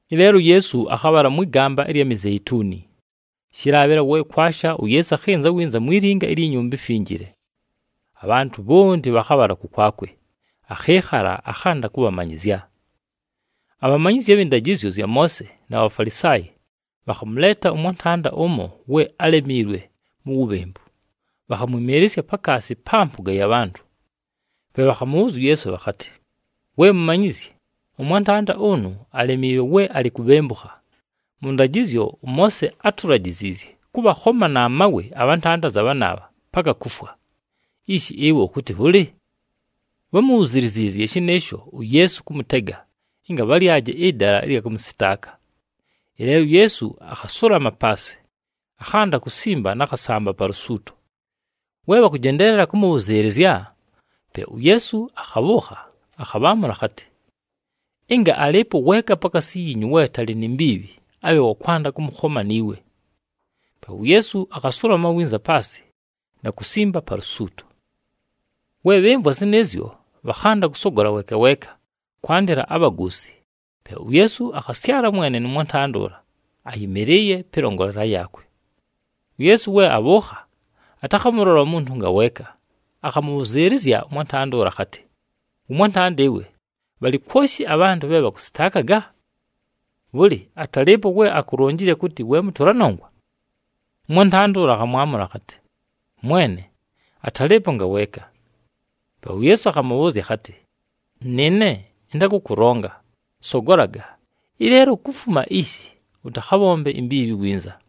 Ɨleelo uYeesu akhabhala mwɨ gamba ɨlya Mizeituni. Shɨlaabhɨla we kwasha, uYeesu akhɨnza winza mwi linga ilyi Nyumba iMfinjile. Abhantʉ bhonti bhakhabhala kʉkwakwe, akhɨɨkhala, akhanda kʉbhamanyɨzya. Abhamanyizyi abhɨ ndajɨzyo zya Moose na Bhafalisaayi bhakhamʉleeta ʉmwantanda ʉmo we álemiilwe mu wubhembu. Bhakhamwɨmɨɨlɨsya pakaasi pa mpʉga ya bhantʉ. Pe bhakhamʉbhʉʉzya uYeesu bhakhatɨ, “We Mumanyizyi, ʉmwantanda ʉnʉ alemiilwe we alɨ kubhembukha. Mʉ ndajɨzyo, ʉMoose átulajiziizye kʉbhakhoma na mawe abhantanda anza bhanaabha, paka kufwa. Ishi, ɨwe ʉkʉtɨ bhʉlɨ?” Bhámubhuziliziizye shɨnɨɨsho uYeesu kʉmʉtega ɨnga bhalyaje ɨdala ɨlya kʉmʉsɨtaaka. Ɨleelo uYeesu, akhasulama paasɨ, akhanda kusimba na khasamba pa lusuuto. We bhakʉjendeelela kʉmʉbhʉzɨɨlɨzya, pe uYeesu akhabhʉʉkha, akhabhaamʉla akhatɨ, “Ɨnga alɨɨpo weeka pakaasi yiinyu we atalɨ ni mbiibhi, abhe wa kwanda kʉmʉkhoma ni we.” Pe uYeesu akhasulama winza paasɨ na kusimba pa lusuuto. We bhɨmvwa zɨnɨɨzyo, bhakhanda kʉsogola weeka weeka, kwandɨla abhagoosi. Pe uYeesu akhasyala mwene nʉ mwantanda ʉla, ayɨmɨlɨɨye pɨlongolela yaakwe. UYeesu we abhʉʉkha, atakhamʉlola umuntu ngaweeka, akhamʉbhʉzɨɨlɨzya ʉmwantanda ʉla akhatɨ, “Wʉmwantanda ɨwe, bhalɨ kwoshi abhantʉ bhe bhakʉsɨtaakaga? Bhʉlɨ, atalɨɨpo we akulonjile kʉtɨ we mʉtʉla nongwa?” Ʉmwantanda ʉla akhamwamʉla akhatɨ, “Mwene, atalɨɨpo ngaweeka.” Pe uYeesu akhamʉbhʉʉzya akhatɨ, “Nɨɨne ɨntakʉkʉlonga. Sogolaga, ɨleelo kufuma ishi, ʉtakhabhombe imbiibhi winza.”]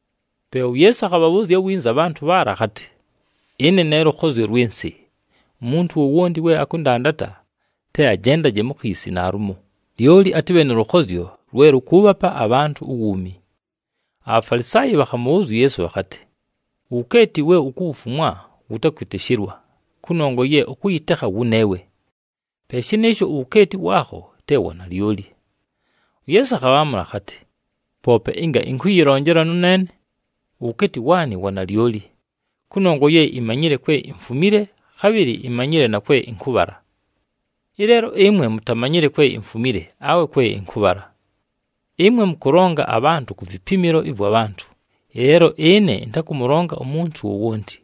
Pe uYeesu akhabhabhʉʉzya winza abhantʉ bhaala akhatɨ, “Ɨne ne lʉkhozyo lwɨ nsɨ, umuntu wowonti we akʉndandata, te ajendaje mu khiisi naalumo, lyoli atɨbhe nʉ lʉkhozyo lwe lʉkʉʉbhapa abhantʉ uwuumi.” ABhafalisaayi bhakhamʉbhʉʉzya uYeesu bhakhatɨ, “Uwukeeti we ukufumwa wʉtakwɨtɨshɨlwa, kʉnongwa ye ʉkʉyɨtekha wʉneewe. Pe shɨnɨɨsho uwukeeti waakho te wa nalyoli.” UYeesu akhabhaamʉla akhatɨ, “Poope ɨnga ɨnkʉyɨlonjela nʉneene, uwukeeti waanɨ wa nalyoli, kʉnongwa ye imanyile kwe imfumile, khabhɨlɨ imanyile na kwe ɨnkʉbhala. Ɨleelo ɨmwe mutamanyile kwe imfumile awe kwe ɨnkʉbhala. Ɨmwe mʉkʉlonga abhantʉ ku vipimilo ɨvwa bhantʉ, ɨleelo ɨne ɨntakʉmʉlonga umuntu wowonti.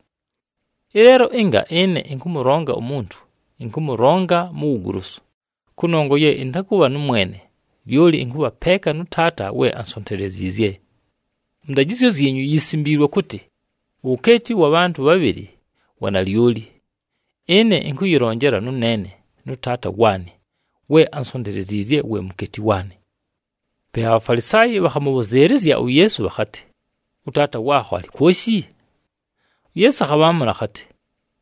Ɨleelo ɨnga ɨne ɨnkʉmʉlonga umuntu, ɨnkʉmʉlonga mu wugolosu, kʉnongwa ye ɨntakʉbha nʉmwene, lyoli ɨnkʉbha peeka nʉ Taata we ansonteleziizye. Mʉ ndajɨzyo zyinyu yisimbiilwe kʉtɨ, ‘Uwukeeti ʉwa bhantʉ bhabhɨlɨ wa nalyoli.’ Ɨne ɨnkʉyɨlonjela nʉneene nʉ Taata waanɨ we ansonteleziizye we mukeeti waanɨ.” Pe aBhafalisaayi bhakhamʉbhʉzɨɨlɨzya uYeesu bhakhatɨ, “ɄTaata waakho alɨ kwoshi?” UYeesu akhabhaamʉla akhatɨ,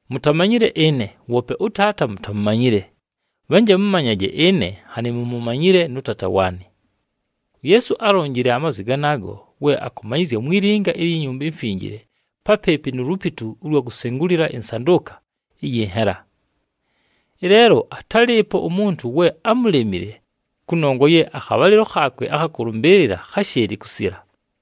“Mutamanyile ɨne, woope ʉTaata mutamumanyile. Bhanje mʉmanyaje ɨne nhanɨ mumumanyile nʉ Taata waanɨ.” UYeesu álonjile amazwi ganaago we akʉmanyɨzya mwi linga ilyi Nyumba iMfinjile papɨɨpɨ nu lupitu ʉlwa kusengulila ɨnsandʉʉka ɨyɨ nhela. Ɨleelo atálɨɨpo umuntu we ámulemile kʉnongwa ye akhabhalɨlo khaakwe akha kʉlʉmbɨɨlɨla kháshɨɨlɨ kusila.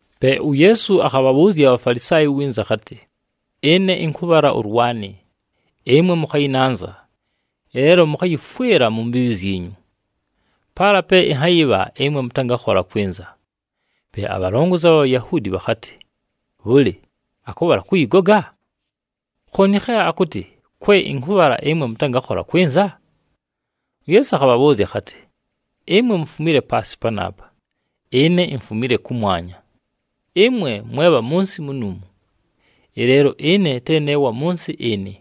Pe uYeesu akhabhabhʉʉzya aBhafalisaayi winza akhatɨ, “Ɨne ɨnkʉbhala ʉlwanɨ, ɨmwe mʉkhayɨnanza, ɨleelo mʉkhayɨfwɨla mu mbiibhi zyinyu. Paala pe ɨnhayɨbha ɨmwe mʉtangakhola kwɨnza.” Pe abhalongozi abha Bhayahuudi bhakhatɨ, “Bhʉlɨ, akʉbhala kʉyɨgoga? Khooni khe akʉtɨ, ‘Kwe ɨnkʉbhala ɨmwe mʉtangakhola kwɨnza’?” UYeesu akhabhabhʉʉzya akhatɨ, “Ɨmwe mufumile paasɨ panaapa, ɨne imfumile kʉmwanya. Ɨmwe mwe bha mʉ nsɨ munuumu, ɨleelo ɨne te ne wa mʉ nsɨ ɨnɨ.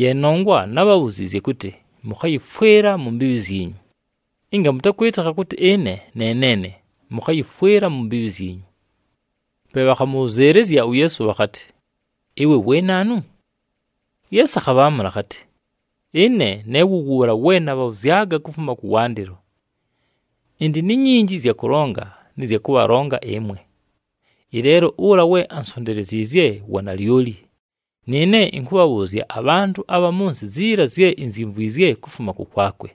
Ye nongwa nábhabhuziizye kʉtɨ mʉkhayɨfwɨla mu mbiibhi zyinyu. Ɨnga mʉtakwɨtɨkha kʉtɨ ɨne ne neene, mʉkhayɨfwɨla mu mbiibhi zyinyu.” Pe bhakhamʉbhʉzɨɨlɨzya uYeesu bhakhatɨ, “Ɨwe we naanu?” UYeesu akhabhaamʉla akhatɨ, “Ɨne ne wʉ wʉʉla we nabhabhʉzyaga kufuma kʉwandɨlo. Ɨndɨ ni nyinji ɨzya kʉlonga nɨ zya kʉbhalonga ɨmwe, ɨleelo ʉla we ansonteleziizye wa nalyoli, nɨɨne ɨnkʉbhabhʉʉzya abhantʉ abha mʉ nsɨ ziila zye inzyimvwizye kufuma kʉkwakwe.”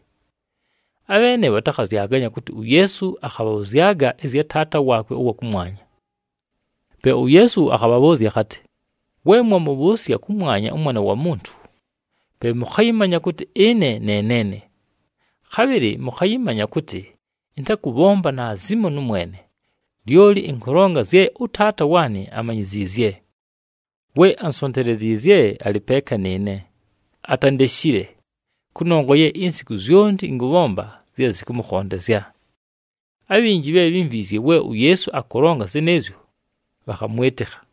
Abheene bhatakhazyaganya kʉtɨ uYeesu akhabhabhʉzyaga ɨzya Taata waakwe ʉwa kʉmwanya. Pe uYeesu akhabhabhʉʉzya akhatɨ, “We mwamʉbhʉʉsya kʉmwanya ʉMwana wa Muntu, pe mʉkhayɨmanya kʉtɨ ɨne ne neene. Khabhɨlɨ mʉkhayɨmanya kʉtɨ ɨntakʉbhomba naazimo nʉmwene, lyoli ɨnkʉlonga zye ʉTaata waanɨ amanyiziizye. We ansonteleziizye alɨ peeka nɨɨne, atandeshile, kʉnongwa ye insiku zyonti ɨnkʉbhomba zye zɨkʉmʉkhondezya.” Abhinji bhe bhímvwizye we uYeesu akʉlonga zɨnɨɨzyo, bhakhamwɨtɨkha.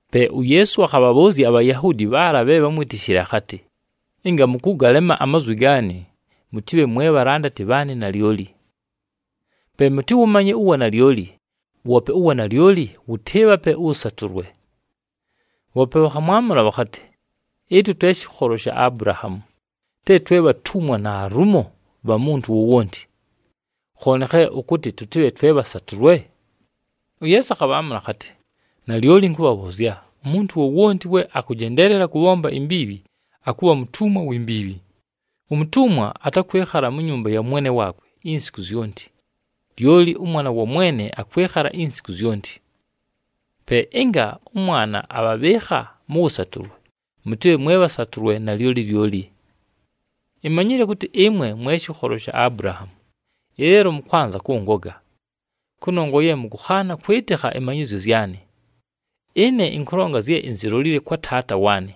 Pe uYeesu akhabhabhʉʉzya aBhayahuudi bhaala bhe bhamwitishile akhatɨ, “Ɨnga mʉkʉgalema amazwi gaanɨ, mʉtɨbhe mwe bhalandati bhaanɨ nalyoli. Pe mʉtɨwʉmanye uwanalyoli, woope uwanalyoli wʉtɨɨbhape ʉwʉsatʉlwe.” Bhoope bhakhamwamʉla bhakhatɨ, “Ɨtwe twe shɨkholo sha Abulahaamu. Te twe bhatumwa naalumo bha muntu wowonti. Khooni khe ʉkʉtɨ tʉtɨbhe twe bhasatʉlwe?” UYeesu akhabhaamʉla akhatɨ, “Nalyoli ɨnkʉbhabhʉʉzya, umuntu wowonti we akʉjendeelela kʉbhomba imbiibhi, akʉbha mutumwa wi mbiibhi. Umutumwa atakwɨkhala mu nyumba ya mwene waakwe insiku zyonti, lyoli ʉmwana wa mwene akwɨkhala insiku zyonti. Pe ɨnga ʉMwana abhabhɨɨkha mʉ wʉsatʉlwe mʉtɨbhe mwe bhasatʉlwe nalyoli lyoli. Imanyile kʉtɨ ɨmwe mwe shɨkholo sha Abulahaamu, ɨleelo mʉkwanza kʉngoga, kʉnongwa ye mʉkʉkhaana kwɨtɨkha ɨmanyɨzyo zyanɨ. Ɨne ɨnkʉlonga zye inzilolile kwa Taata waanɨ,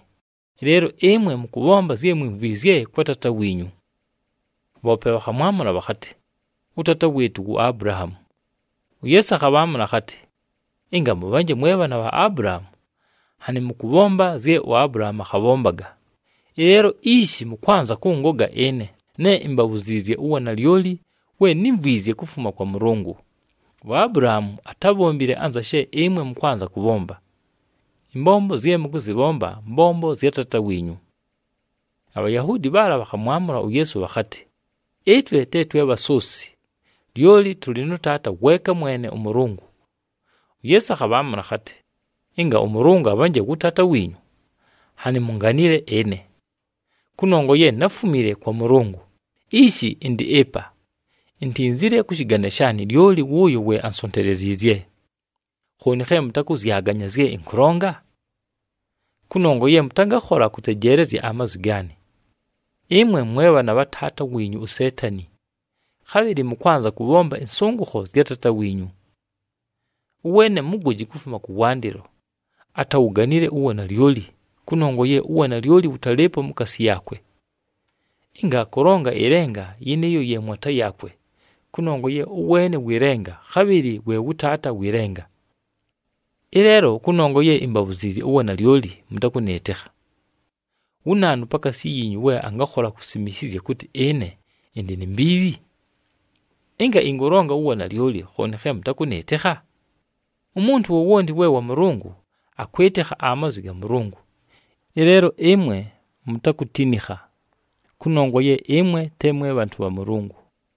ɨleelo ɨmwe mʉkʉbhomba zye mwimvwizye kwa taata wiinyu.” Bhoope bhakhamwamʉla bhakhatɨ, “Ʉtaata wɨɨtʉ wu Abulahaamu.” UYeesu akhabhaamʉla akhatɨ, “Ɨnga mʉbhanje mwe bhaana bha Abulahaamu, nhanɨ mʉkʉbhomba zye uAbulahaamu akhabhombaga. Ɨleelo ishi mʉkwanza kʉngoga ɨne, ne imbabhuziizye uwanalyoli we nímvwizye kufuma kwa Mʉlʉngʉ. UAbulahaamu atábhombile anza she ɨmwe mʉkwanza kʉbhomba. Ɨmbombo zye mʉkʉzɨbhomba mbombo zya Taata wiinyu.” ABhayahuudi bhaala bhakhamwamʉla uYeesu bhakhatɨ, “Ɨtwe te twe bhasoosi, lyoli tʉlɨ nʉ Taata weeka mwene ʉMʉlʉngʉ.” UYeesu akhabhaamʉla akhatɨ, “Ɨnga ʉMʉlʉngʉ abhanje wʉ Taata wiinyu, nhanɨ munganile ɨne. Kʉnongwa ye náfumile kwa Mʉlʉngʉ, ishi ɨndɨ ɨpa. Intinzile kʉ shɨgane shaanɨ, lyoli wʉʉyo ansonteleziizye. Khooni khe mʉtakʉzyaganya zye ɨnkʉlonga? Kʉnongwa ye mʉtangakhola kʉtejeelezya amazwi gaanɨ. Ɨmwe mwe bhaana bha taata wiinyu uSeetani, khabhɨlɨ mʉkwanza kʉbhomba ɨnsʉngʉkho zya taata wiinyu. Ʉweene mugoji kufuma kʉwandɨlo, atawuganile uwanalyoli, kʉnongwa ye uwanalyoli wʉtalɨɨpo mukaasi yaakwe. Ɨnga akʉlonga ɨlenga, yɨnɨɨyo ye mwata yaakwe, kʉnongwa ye ʉweene wɨ lenga, khabhɨlɨ we wʉ taata wɨ lenga. Ɨleelo kʉnongwa ye imbabhuziizye uwanalyoli mʉtakʉnɨɨtɨkha. Wu naanu pakaasi yiinyu we angakhola kusimishizya kʉtɨ ɨne ɨndɨ ni mbiibhi? Ɨnga ɨnkʉlonga uwanalyoli, khooni khe mʉtakʉnɨɨtɨkha? Umuntu wowonti we wa Mʉlʉngʉ, akwɨtɨkha amazwi ga Mʉlʉngʉ. Ɨleelo ɨmwe mutakutinikha, kʉnongwa ye ɨmwe te mwe bhantʉ bha Mʉlʉngʉ.”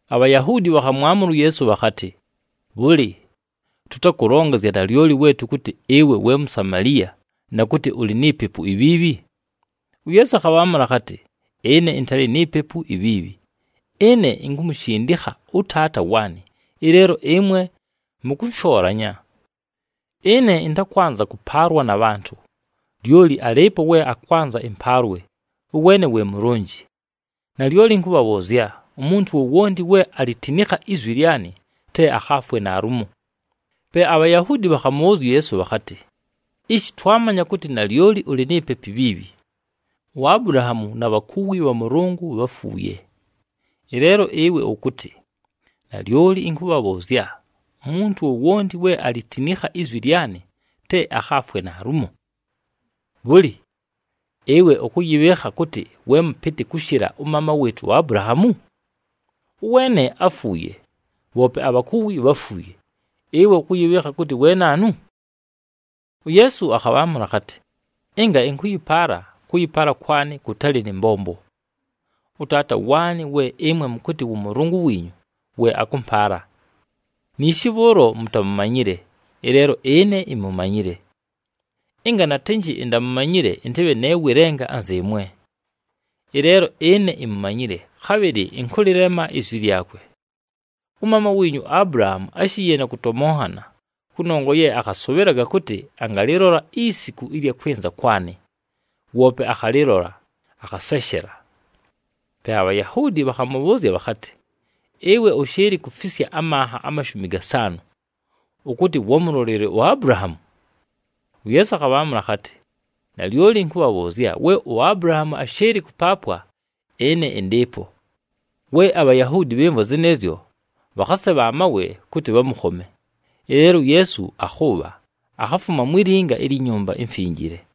ABhayahuudi bhakhamwamʉla uYeesu bhakhatɨ, “Bhʉlɨ, tʉtakʉlonga zya nalyoli we tʉkʉtɨ ɨwe we Musamaliya na kʉtɨ ʉlɨ ni pepu ibhiibhi?” UYeesu akhabhaamʉla akhatɨ, “Ɨne ɨntalɨ ni pepu ibhiibhi. Ɨne inkumushindikha ʉTaata waanɨ, ɨleelo ɨmwe mʉkʉnshoolanya. Ɨne ɨntakwanza kʉpaalwa na bhantʉ. Lyoli alɨɨpo we akwanza ɨmpaalwe, ʉweene we mulonji. Nalyoli ɨnkʉbhabhʉʉzya, umuntu wowonti we alitinikha izwi lyanɨ, te akhaafwe naalumo!” Pe aBhayahuudi bhakhamʉbhʉʉzya uYeesu bhakhatɨ, “Ishi twamanya kʉtɨ nalyoli ʉlɨ ni pepu ibhiibhi! UAbulahaamu na bhakuwi bha Mʉlʉngʉ bháfuuye, ɨleelo ɨwe ʉkʉtɨ, ‘Nalyoli ɨnkʉbhabhʉʉzya, umuntu wowonti we alitinikha izwi lyanɨ, te akhaafwe naalumo!’ Bhʉlɨ, ɨwe ʉkʉyɨbhɨɨkha kʉtɨ we mʉpɨtɨ kʉshɨla ʉmaama wɨɨtʉ uAbulahaamu? Ʉweene áfuuye, bhoope abhakuwi bháfuuye. Ɨwe ʉkʉyɨbhɨɨkha kʉtɨ we naanu?” UYeesu akhabhaamʉla akhatɨ, “Ɨnga ɨnkʉyɨpaala, kʉyɨpaala kwanɨ kʉtalɨ nɨ mbombo. ɄTaata waanɨ we ɨmwe mʉkʉtɨ wʉ Mʉlʉngʉ wiinyu, we akʉmpaala. Niishi bhʉʉlo mutamumanyile, ɨleelo ɨne imumanyile. Ɨnga natɨnjɨ intamumanyile, ɨntɨbhe ne wɨ lenga anzɨɨmwe. Ɨleelo ɨne imumanyile, khabhɨlɨ ɨnkʉlɨlema izwi lyakwe. Ʉmaama wiinyu uAbulahaamu áshiiye na kʉtomonhana kʉnongwa ye akhasʉbhɨlaga kʉtɨ angalɨlola isiku ɨlya kwɨnza kwanɨ, woope akhalɨlola, akhaseshela.” Pe aBhayahuudi bhakhamʉbhʉʉzya bhakhatɨ, “Ɨwe ʉshɨɨlɨ kufisya amanha amashumi gasaanʉ, ʉkʉtɨ wámulolile uAbulahaamu?” UYeesu akhabhaamʉla akhatɨ, “Nalyoli ɨnkʉbhabhʉʉzya, we uAbulahaamu áshɨɨlɨ kʉpaapwa, ɨne ɨndɨɨpo.” We aBhayahuudi bhɨmvwa zɨnɨɨzyo, bhakhasebha amawe kʉtɨ bhamʉkhome, ɨleelo uYeesu akhʉʉbha, akhafuma mwi linga ilyi Nyumba iMfinjile.